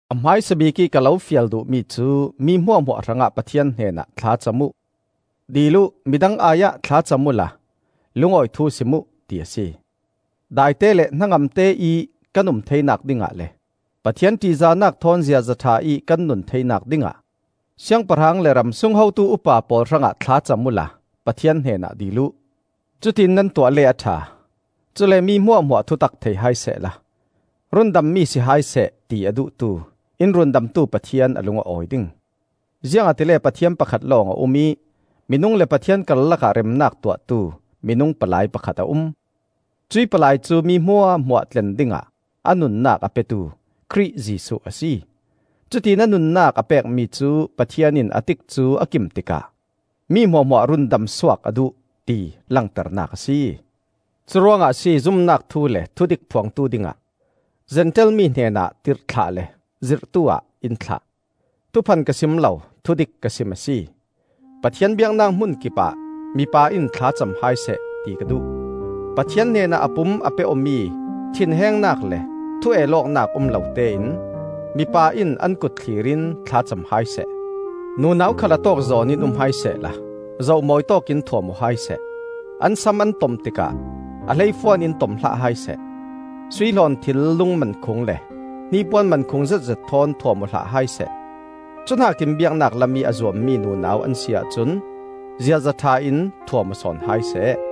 A hmaisa bikih ka lo fial duhmi cu mi hmuahhmuah hrangah Pathian hnenah thlacam uh, dil uh, midang ai-ah thlacam uhla lungawi thu sim uh, ti a si. Daite le hnangamte ih kan um theinak dingah le Pathian ṭihzahnak thawn ziaza ṭha ih kan nun theinak dingah siangpahrang le ramsung hotu upa pawl hrangah thla cam uhla Pathian hnenah dil uh. Cutiin nan tuah le a ṭha; cule mi hmuahhmuah thutak thei hai sehla, rundammi si hai seh ti a duhtu, in Rundamtu Pathian a lung a awi ding. Ziangahtile Pathian pakhat lawng a um ih minung le Pathian karlakah remnak tuahtu minung palai pakhat a um. Cuih palai cu mi hmuahhmuah tlen dingah a nunnak a petu Khrih Jesuh a si. Cutiin a nunnak a pekmi cu Pathian in a tikcu a kim tikah mi hmuahhmuah rundamsuak a duh, ti langternak a si. Curuangah a si zumnak thu le thudik phuangtu dingah Zentail mi hnenah tirhthlah le zirhtu-ah in thlah. Thuphan ka sim lo, thudik ka sim a si! Pathian biaknak hmun kipah mipa in thla cam hai seh ti ka duh. Pathian hnenah a pum a pe awmi thinhengnak le thu-el awknak um lotein mipa in an kut thlir in thla cam hai seh. Nunau khal a tawkzawn in um hai sehla zoh-mawi tawkin thuam aw hai seh. An sam an tom tikah a hleifuan in tom hlah hai seh; sui hlawnthil, lung mankhung le hnipuan mankhung zetzet thawn thuam aw hlah hai seh. Cuhnakin biaknak lamih a zuammi nunau an si ahcun ziaza ṭha in thuam aw sawn hai seh.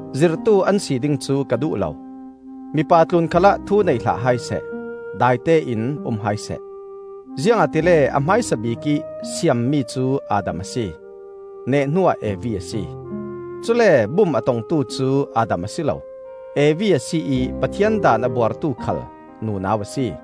Zirhtu an si ding cu ka duh lo; mipa tlun khalah thu nei hlah hai seh. Daite in um hai seh. Ziangahtile a hmaisa bikih siammi cu Adam a si; neh hnuah Evi a si. Cule bum a tongtu cu Adam a si lo, Evi a si ih Pathian daan a buartu khal nunau a si.